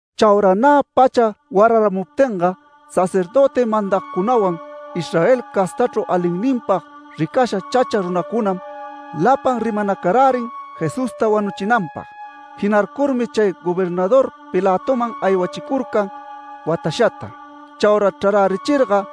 Chaura nä pacha wararamuptinga sacerdöti mandagcunawan Israel castachru alinninpag ricasha chacha runacunam lapan rimanacarärin Jesusta wanuchinanpag. Jinarcurmi chay gobernador Pilatoman aywachicurcan watashata. Chaura chrarärichirga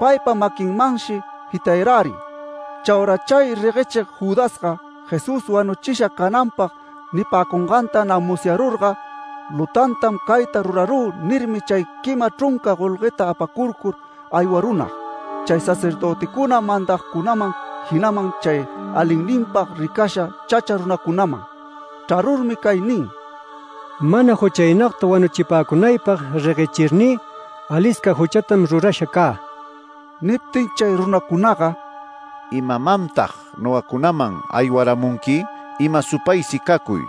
paypa maquinmanshi jitayarärin. Chaura chay reguechig Judasga Jesús wanuchisha cananpag nipäcunganta nä musyarurga “Lutantam cayta rurarü” nirmi, chay quima chrunca golgueta apacurcur aywarunag, chay sacerdöticuna mandagcunaman jinaman chay alinninpag ricasha chacha runacunaman chrarurmi cay nin: “Mana juchaynagta wanuchipäcunaypag reguechirnï alisca juchatam rurasha cä”. Niptin chay runacunaga “¿Imamantag nogacunaman aywaramunqui? ¡Ima supaysi cacuy!”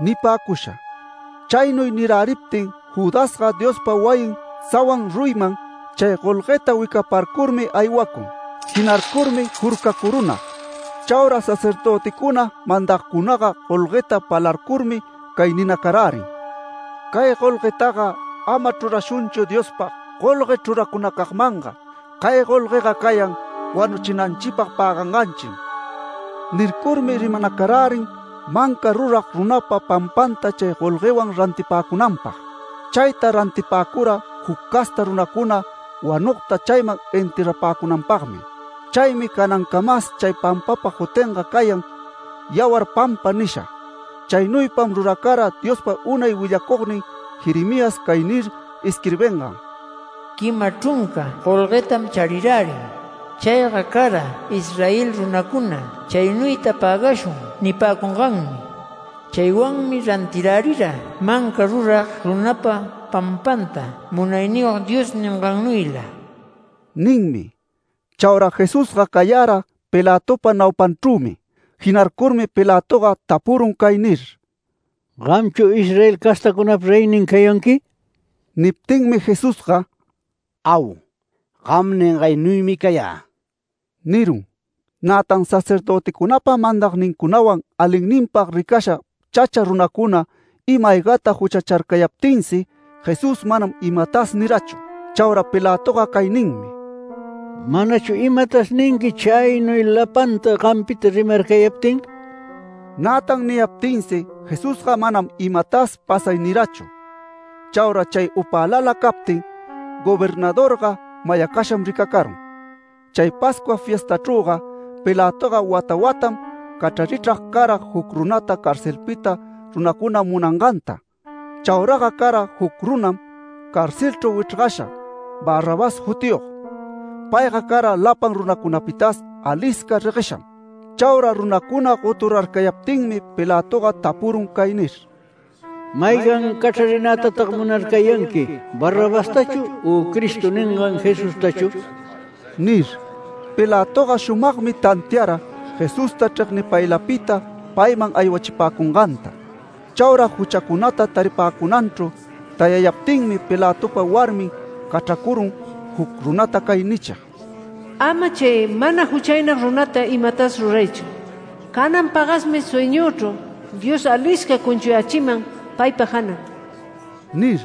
nipäcusha. Chaynuy niräriptin Judasga Diospa wayin sawan ruyiman chay golgueta wicaparcurmi aywacun. Jinarcurmi jurcacurunag. Chaura sacerdöticuna mandagcunaga golgueta palarcurmi cay ninacarärin: “Cay golguetaga ama chrurashunchu Diospag golgue chruracunacagmanga. Cay golguega cayan wanuchinanchipag päganganchim”. Nircurmi rimanacarärin manca rurag runapa pampanta chay golguewan rantipäcunanpag. Chayta rantipäcura juc casta runacuna wanugta chayman enterrapäcunanpagmi. Chaymi canancamas chay pampapa jutinga cayan ‘Yawar pampa’ nisha. Chaynuypam ruracara Diospa unay willacugnin Jeremías cay nir isquirbingan: “Quima chrunca golguetam charirärin. Chayga cara Israel runacuna ‘Chaynuyta pägashun’ nipäcunganmi. Chaywanmi rantirärira ‘Manca rurag runapa pampanta’ Munayniyog Dios ningannuyla” ninmi. Chaura Jesusga cayara Pilatopa naupanchrümi. Jinarcurmi Pilatoga tapurun cay nir: “¿Gamchu Israel castacunapa reynin cayanqui?” Niptinmi Jesusga “Au, gam ningaynuymi cayä” nirun. Nätan sacerdöticunapa mandagnincunawan alinninpag ricasha chacha runacuna ima-aygata juchacharcayaptinsi, Jesús manam imatas nirachu. Chaura Pilatoga cay ninmi: “¿Manachu imatas ninqui chaynuy lapanta gampita rimarcayaptin?” Nätan niyaptinsi Jesusga manam imatas pasay nirachu. Chaura chay upälala captin, gobernadorga mayacasham ricacarun. Chay Pascua fiestachrüga, Pilatoga wata watam cachrarichrag cara juc runata carcelpita runacuna munanganta. Chauraga cara juc runam carcelchru wichrgasha Barrabás jutiyog. Payga cara lapan runacunapitas alisca reguesham. Chaura runacuna goturarcayaptinmi Pilatoga tapurun cay nir: “¿Maygan cachrarinätatag munarcayanqui? ¿Barrabastachu? u ¿‘Cristo’ ningan Jesustachu?” nir. Pilatoga shumagmi tantiara Jesusta chregnipaylapita payman aywachipäcunganta. Chaura juchacunata taripäcunanchru tayayaptinmi Pilatopa warmin cachracurun juc runata cay nichig: “Ama chay mana juchaynag runata imatas ruraychu. Canan pagasmi sueñüchru Dios alisca cunchuyächiman paypa janan” nir.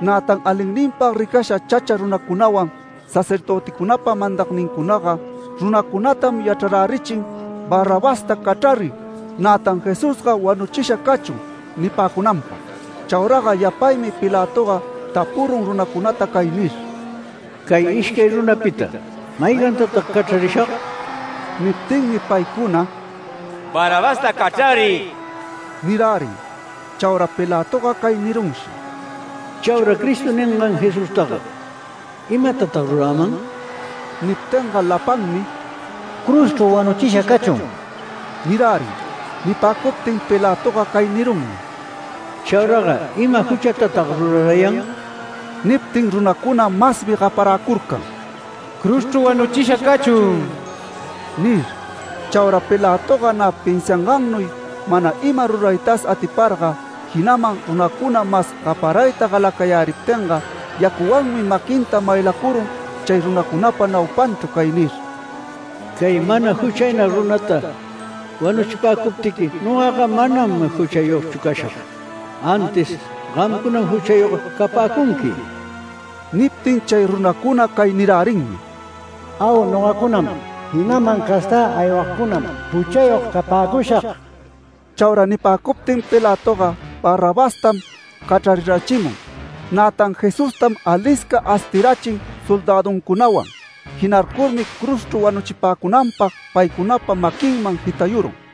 Nätan alinninpag ricasha chacha runacunawan sacerdöticunapa mandagnincunaga runacunatam yachrarärichin “¡Barrabasta cachrariy! Nätan Jesusga ¡wanuchisha cachun!” nipäcunanpag. Chauraga yapaymi Pilatoga tapurun runacunata cay nir: “Cay ishcay runapita ¿maygantatag cachrarishag?” Niptinmi paycuna “Barrabasta cachrariy” nirärin. Chaura Pilatoga cay nirunshi: “Chaura ‘Cristo’ ningan Jesustaga ¿imatatag ruräman?” Niptinga lapanmi “¡Cruzchru wanuchisha cachun!” nirärin. Nipäcuptin Pilatoga cay nirunmi: “Chauraga ¿ima juchatatag rurarayan?” Niptin runacuna masmi gaparäcurcan “¡Cruzchru wanuchisha cachun!” nir. Chaura Pilatoga nä pinsiangannuy mana ima ruraytas atiparga, jinaman runacuna mas gaparayta galacayäriptinga, yacuwanmi maquinta maylacurun chay runacunapa naupanchru cay nir: “Cay mana juchaynag runata wanuchipäcuptiqui nogaga manam juchayogchu cashag, ¡antis gamcunam juchayog capäcunqui!” Niptin chay runacuna cay nirärinmi: “Au, nogacunam jinaman castä aywagcunam juchayog capäcushag”. Chaura nipäcuptin Pilatoga Barrabastam cachrarirachimun. Nätan Jesustam alisca astirachin soldäduncunawan. Jinarcurmi cruzchru wanuchipäcunanpag paycunapa maquinman jitayurun.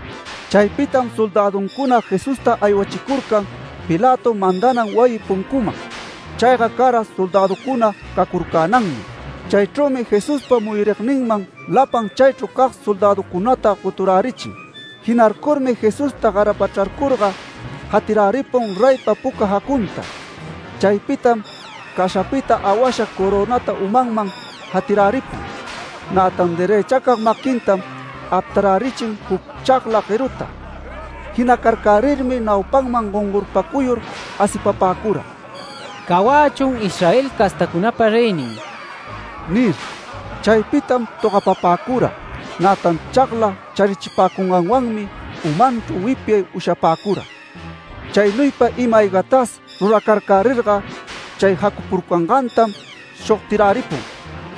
Chaypitam soldäduncuna Jesusta aywachicurcan Pilato mandanan wayi puncuman. Chayga cara soldäducuna cacurcänanmi. Chaychrümi Jesuspa muyurigninman lapan chaychru cag soldäducunata goturärichin. Jinarcurmi Jesusta garapachrarcurga, jatiräripun reypa puca jacunta. Chaypitam cashapita awasha corönata umanman jatiräripun. Nätan derëchacag maquintam aptarärichin juc chagla gueruta. Jinacarcärirmi naupanman gongorpacuyur asipapäcura “Cawachun Israel castacunapa reynin” nir. Chaypitam togapapäcura. Nätan chagla charichipäcunganwanmi umanchru wipyay ushapäcura. Chaynuypa ima-aygatas ruracarcärirga, chay jacupurcangantam shogtiräripun.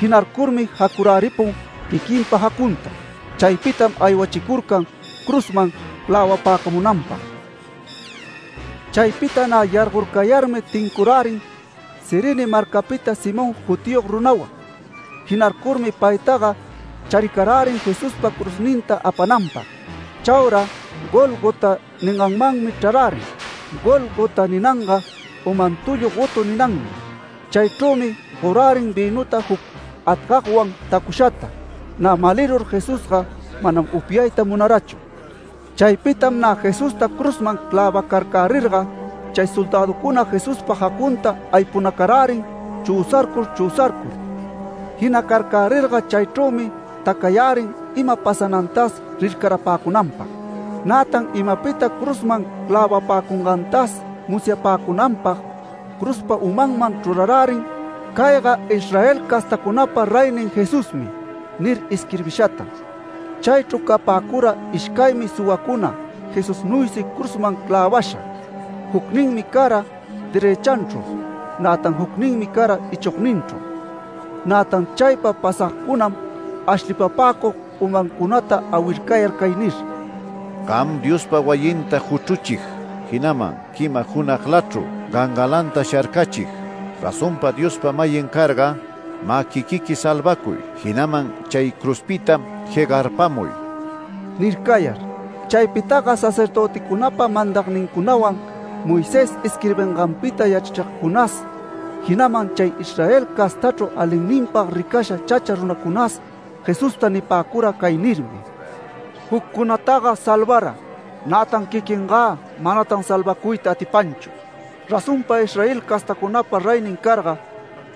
Jinarcurmi jacuräripun quiquinpa jacunta. Chaypitam aywachicurcan cruzman clävapäcamunanpag. Chaypita nä yargorcayarmi tincurärin Cirene marcapita Simón jutiyog runawan. Jinarcurmi paytaga charicarärin Jesuspa cruzninta apananpag. Chaura ‘Gólgota’ ninganmanmi chrarärin. (‘Gólgota’ ninanga ‘Uman tullu gotu’ ninanmi.) Chaychrümi gorärin vïnuta juc atgagwan tacushata. Nä malirur Jesusga manam upyayta munarachu. Chaypitam nä Jesusta cruzman clävacarcärirga, chay soldäducuna Jesuspa jacunta aypunacarärin chüsarcur chüsarcur. Jinacarcärirga chaychrümi tacayärin ima pasanantas rircarapäcunanpag. Nätan imapita cruzman clävapäcungantas musyapäcunanpag cruzpa umanman chrurarärin “CAYGA ISRAEL CASTACUNAPA REYNIN JESUSMI” nir isquirbishata. Chaychru capäcura ishcaymi suwacuna Jesusnuysi cruzman clävasha, jucninmi cara derëchanchru, nätan jucninmi cara ichogninchru. Nätan chaypa pasagcunam ashlipapäcug umancunata awircayar cay nir: “¡Gam Diospa wayinta juchruchig jinaman quima junaglachru gangalanta sharcachig, razonpa Diospa-mayin carga, mä quiquiqui salvacuy! Jinaman chay cruzpita jegarpamuy” nircayar. Chaypitaga sacerdöticunapa mandagnincunawan Moisés isquirbinganpita yachrachigcunas, jinaman chay Israel castachru alinninpag ricasha chacha runacunas Jesusta nipäcura cay nirmi: “Juccunataga salvara, nätan quiquingä manatan salvacuyta atipanchu. Razonpa Israel castacunapa reynin carga,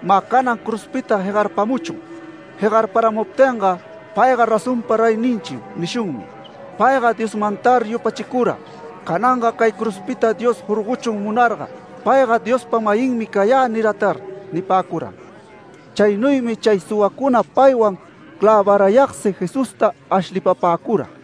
mä canan cruzpita jegarpamuchun. Jegarparamuptinga ‘Payga razonpa reyninchim’ nishunmi. Payga Diosmantar yupachicura, cananga cay cruzpita Dios jorgochun munarga. Payga ‘Diospa-mayinmi cayä’ niratar” nipäcuram. Chaynuymi chay suwacuna paywan clävarayagsi Jesusta ashlipapäcura.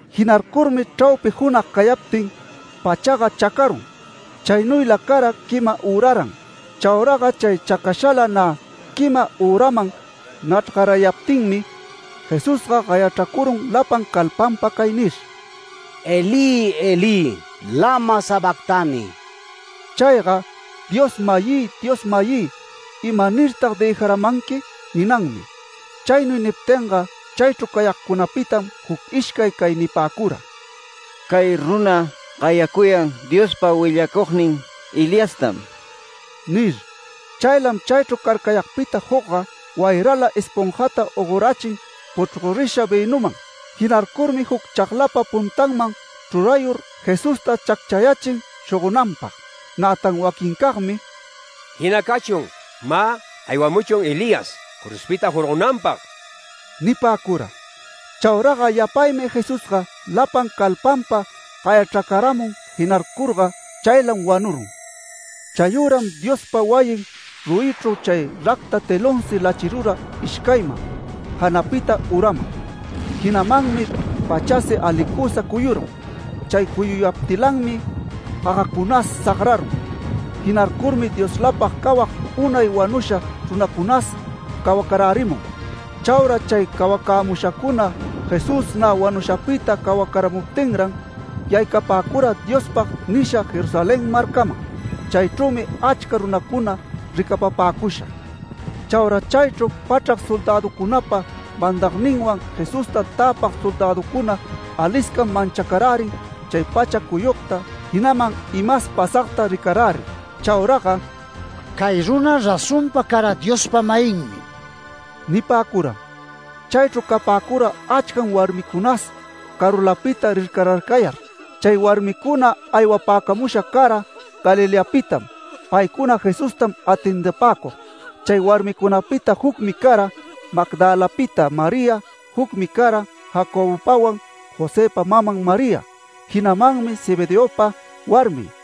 Jinarcurmi chraupi junag cayaptin pachaga chacarun. Chaynuyla cara quima üraran. Chauraga chay chacashala nä quima üraman nachrgarayaptinmi, Jesusga gayachracarun lapan calpanpam cay nir: “Elí, Elí, lama sabactani”. (Chayga ‘Dios-mayï, Dios-mayï, ¿imanirtag dëjaramanqui?’ ninanmi.) Chaynuy niptinga chaychru cayagcunapitam juc ishcay cay nipäcura: “Cay runa gayacuyan Diospa willacugnin Eliastam” nir. Chaylam chaychru carcayagpita jucga wayrala esponjata ogorachin puchgorisha vïnuman. Jinarcurmi juc chaglapa puntanman chrurayur Jesusta chacchayächin shogonanpag. Nätan waquincagmi “Jina cachun, mä aywamuchun Elías cruzpita jorgonanpag” nipäcura. Chauraga yapaymi Jesusga lapan calpanpa gayachracaramun. Jinarcurga chaylam wanurun. Chayüram Diospa wayin ruyichru chay racta telonsi lachirura ishcayman, janapita uraman. Jinamanmi pachasi alicusa cuyurun. Chay cuyuyaptilanmi gagacunas sagrarun. Jinarcurmi Dioslapag cawag unay wanusha runacunas cawacarärimun. Chaura chay cawacämushacuna Jesús nä wanushapita cawacaramuptinran, yaycapäcura Diospag nisha Jerusalén marcaman. Chaychrümi achca runacuna ricapapäcusha. Chaura chaychru pachrac soldäducunapa mandagninwan Jesusta täpag soldäducuna aliscam manchacarärin chay pacha cuyugta jinaman imas pasagta ricarärir. Chauraga “Cay runa razonpa cara Diospa-mayinmi” nipäcuram. Chaychru capäcura achcam warmicunas carulapita rircararcayar. Chay warmicuna aywapäcamusha cara Galileapitam, paycuna Jesustam atendipäcug. Chay warmicunapita jucmi cara Magdalapita María, jucmi cara Jacobopawan Josëpa maman María, jinamanmi Zebedeopa warmin.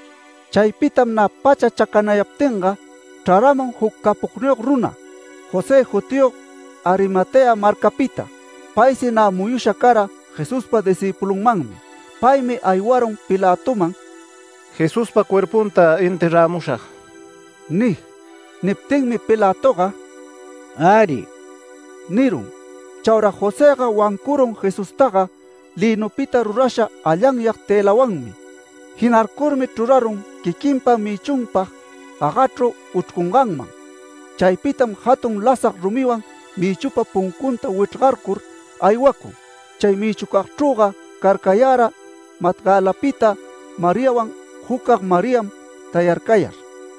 Chaypitam nä pacha chacanayaptinga chraramun juc capogniyog runa, José jutiyog Arimatea marcapita. Paysi nä muyusha cara Jesuspa discïpulunmanmi. Paymi aywarun Pilatoman “Jesuspa cuerpunta enterramushag” nig. Niptinmi Pilatoga “Äri” nirun. Chaura Josëga wancurun Jesustaga lïnupita rurasha allanyag tëlawanmi. Jinarcurmi chrurarun quiquinpa mïchunpag gagachru uchrcunganman. Chaypitam jatun lasag rumiwan mïchupa puncunta wichrgarcur aywacun. Chay mïchucagchrüga carcayara Magdalapita Mariawan jucag Mariam tayarcayar.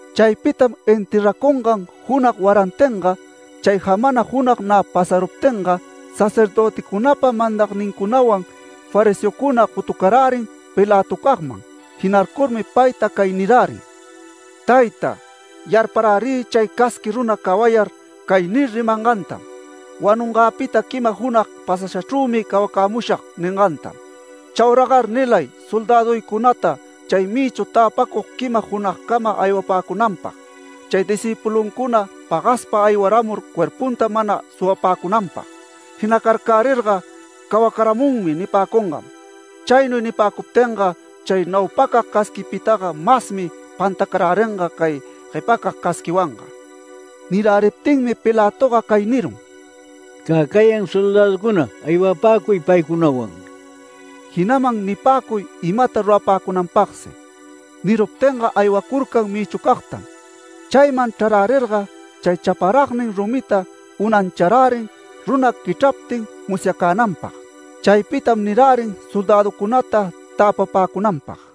Chaypitam enterracungan junag warantinga, chay jamana junag nä pasaruptinga, sacerdöticunapa mandagnincunawan fariseocuna gotucarärin Pilatocagman. Jinarcurmi payta cay nirärin: “Tayta, yarparärï chay casqui runa cawayar, cay nir rimangantam: ‘Wanungäpita quima junag pasashachrümi cawacämushag’ ningantam. Chauragar nilay soldäduycunata chay mïchu täpacug quima junagcama aywapäcunanpag, chay discïpuluncuna pagaspa aywaramur cuerpunta mana suwapäcunanpag. Jinacarcärirga ‘Cawacaramunmi’ nipäcungam. Chaynuy nipäcuptinga, chay naupacag casquipitaga masmi pantacaräringa cay guepacag casquiwanga”. Niräriptinmi Pilatoga cay nirun: “Cä cayan soldäducuna. Aywapäcuy paycunawan”. Jinaman nipäcuy imata rurapäcunanpagsi. Niruptinga aywacurcan mïchuncagtam. Chayman chrarärirga chay chaparagnin rumita unancharärin runa quichraptin musyacänanpag. Chaypitam nirärin soldäducunata tapapäcunanpag.